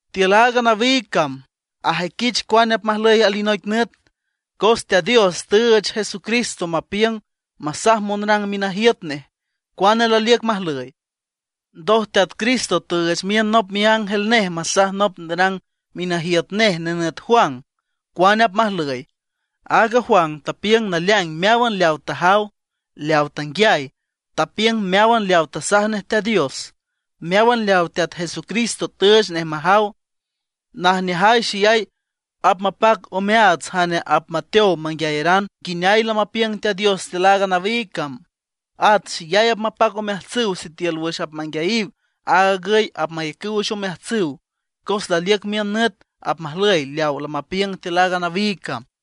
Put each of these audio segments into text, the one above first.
Tiül aaga nawiig cam ajüiquich cuane apmajlüy alinoic nüt. Cos Teat Dios tüüch Jesucristo mapiüng masaj monrang minajiüt nej cuane laliüc majlüy. Ndoj Teat Cristo tüüch miün nop miángel nej masaj nop nerang minajiüt nej nenüt Juan, cuane apmajlüy. Aaga Juan tapiüng naleaing meáwan leawa tajaw, leawa tanguiay; tapiüng meáwan leawa tasaj nej Teat Dios, meáwan leaw Teat Jesucristo tüüch nej majaw. Najneajay xeyay apmapac omeaats jane apmateow manguiayaran nguineay lamapiüng Teat Dios tiül aaga nawiig cam. At xeyay apmapac omeajtsüw sitiül wüx apmanguiayiw aag agüy apmayacüw wüx omeajtsüw; cos laliüc miün nüt apmajlüy leaw lamapiüng tiül aaga nawiig cam.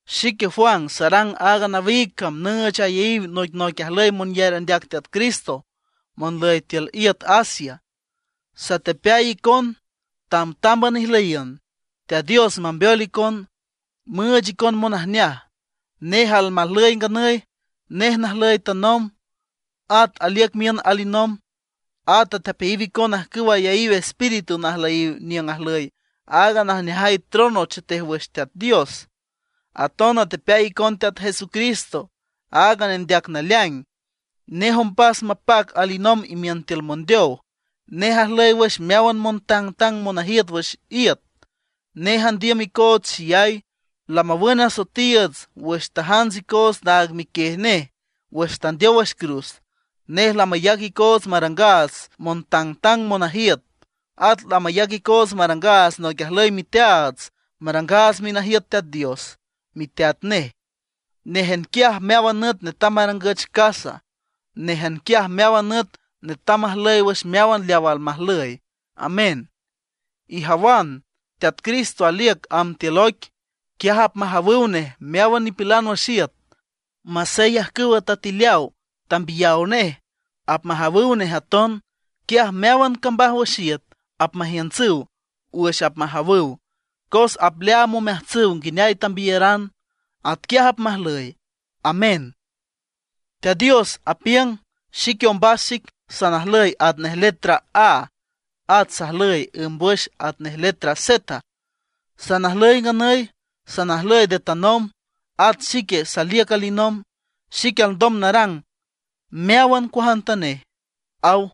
Xique Juan sarang aaga nawiig cam nüüch ayaíw noicnoic ajlüy monyar andeac Teat Cristo monlüy tiül iüt Asia. Satepeay icon, tamtámban ijlüyiüna. Teat Dios mambeol icon, müüch icon monajneaj. Nej almajlüy nganüy, nej najlüy tanomb, at aliüc miün alinomb. At atepeayiw icon ajcüw ayaíw espíritu najlüyiw niüng ajlüy aaga najneajay trono chetej wüx Teat Dios. Aton atepeay icon Teat Jesucristo, aaga nendeac naleaing. Nej ombas mapac alinomb imiün tiül mondeow; nej ajlüy wüx meáwan montangtang monajiüt wüx iüt. Nej andiüm icoots xeyay, lamawün asoetiiüts wüx tajants icoots naag miquiej nej wüx tandeow wüx cruz. Nej lamayac icoots marangaats montangtang monajiüt; at lamayac icoots marangaats noic ajlüy miteaats marangaats minajiüt Teat Dios, miteat nej. Néjan quiaj meáwan nüt netam marangüch casa; néjan quiaj meáwan nüt netam majlüy wüx meáwan leaw almajlüy. Amén. ¡Ijawan, Teat Cristo aliüc amb tiül oic! Quiaj apmajawüw nej meáwan nipilan wüx iüt. Masey ajcüw tatileaw tambiyaw nej apmajawüw nej aton. Quiaj meáwan cambaj wüx iüt apmajiüntsüw wüx apmajawüw, cos apleaam omeajtsüw nguineay tambiyaran. Atquiaj apmajlüy. ¡Amén! Teat Dios apiüng: “Xique ombas xic, salnajlüy atnej letra A; at sajlüy ǘmbwüx atnej letra Z. Salnajlüy nganüy, salnajlüy nde tanomb, at xique saliüc alinomb. Xique alndom narang meáwan cuajantanej”, aw.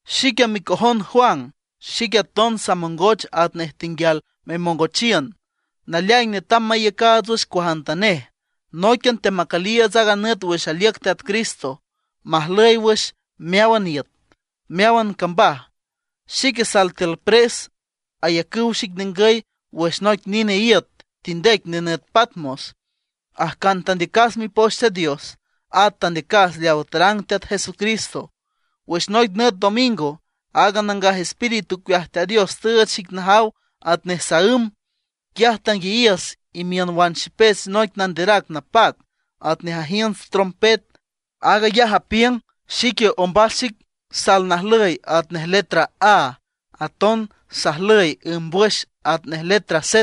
Xique, micojon Juan, xique aton samongoch atnej tenguial memongochiün. Naleaing netam maiücaats wüx cuajantanej. Nóiquian teamacüliiüts aaga nüt wüx aliüc Teat Cristo majlüy wüx meáwan iüt, meáwan cambaj. Xique sal tiül pres, ayacüw xic ningüy wüx noic nine iüt tindec nenüt Patmos, ajcan tandeacas Mipoch Teat Dios, at tandeacas leaw tarang Teat Jesucristo. Wüx noic nüt domingo, aaga Nangaj Espíritu ocueaj Teat Dios tüüch xic najaw atnej saǘm. Quiaj tanguiayiüs imiün wan xipech noic nanderac napac, atnej ajiünts trompet. Aag ayaj apiüng: ―Xique ombas xic salnajlüy atnej letra A; aton sajlüy ǘmbwüx atnej letra Z.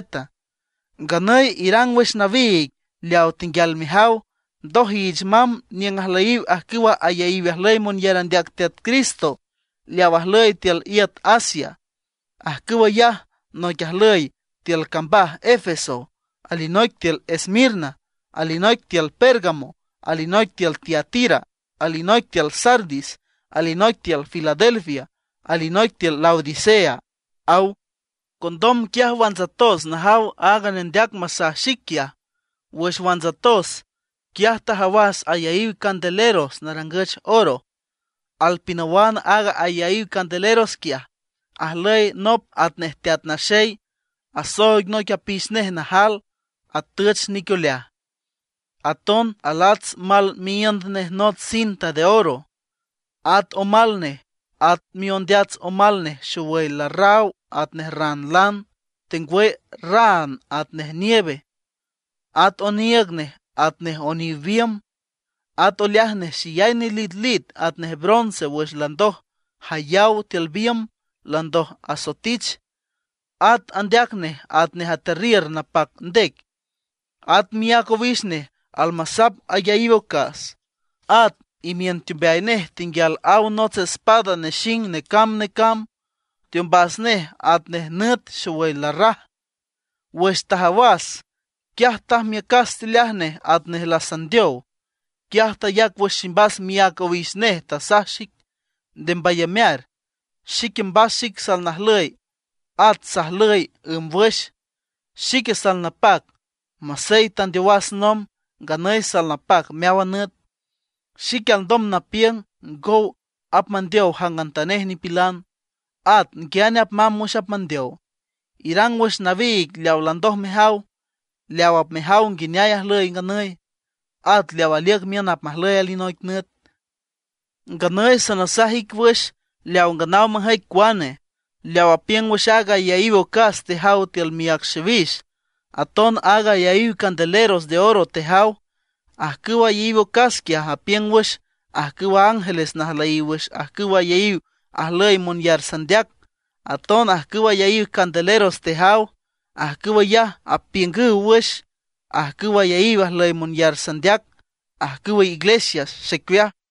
Nganüy irang wüx nawiig leawa tenguial mejaw. Ndoj iich mamb niüng ajlüyiw ajcüw ayaíw ajlüy monyar andeac Teat Cristo leaw ajlüy tiül iüt Asia. Ajcüw ayaj noic ajlüy tiül cambaj Efeso, alinoic tiül Esmirna, alinoic tiül Pérgamo, alinoic tiül Tiatira, alinoic tiül Sardis, alinoic tiül Filadelfia, alinoic tiül Laodicea ―aw. Condom quiaj wantsatos najaw aaga nendeac masaj xic quiaj. Wüx wantsatos, quiaj tajawas ayaíw candeleros narangüch oro. Alpinawan aag ayaíw candeleros quiaj, ajlüy nop atnej Teat Naxey, asooig noic apix nej najal, atüch nic oleaj. Aton alats mal miíünd nej nots cinta de oro. At omal nej, at miondeats omal nej xowüy larraw atnej raan lan, tengwüy raan atnej nieve. At oniiüg nej atnej oniw biümb. At oleaj nej xeyay nelitlit atnej bronce wüx landoj jayaw tiül biümb landoj asoetich. At andeac nej atnej atearriür napac ndec. At miác owix nej almasap ayaíw ocas. At imiün teombeay nej tenguial aw nots espada nexing necamb necamb. Teombas nej atnej nüt xowüy larraj. Wüx tajawas, quiaj tajmiücas teoleaj nej atnej lasandeow. Quiaj tayac wüx ximbas miác owix nej, tasaj xic: ―Nde mbayamear. Xique mbas xic salnajlüy, at sajlüy ǘmbwüx. Xique salnapac, masey tandeowas nomb, nganüy salnapac meáwan nüt. Xique alndom napiüng ngow apmandeow jangantanej nipilan, at nguiane apmamb wüx apmandeow. Irang wüx nawiig leawa landoj mejaw, leaw apmejaw nguineay ajlüy nganüy, at leaw aliüc miün apmajlüy alinoic nüt. Nganüy sanasaj ic wüx leaw nganaw majüic cuane, leaw apiüng wüx aaga ayaíw ocas tejaw tiül miác xiwix, aton aaga ayaíw candeleros de oro tejaw: ajcüw ayaíw ocas quiaj apiüng wüx ajcüwa ángeles najlüyiw wüx ajcüw ayaíw ajlüy monyar sandeac. Aton ajcüw ayaíw candeleros tejaw, ajcüw ayaj apiüngüw wüx ajcüw ayaíw ajlüy monyar sandeac, ajcüw iglesias xicueaj.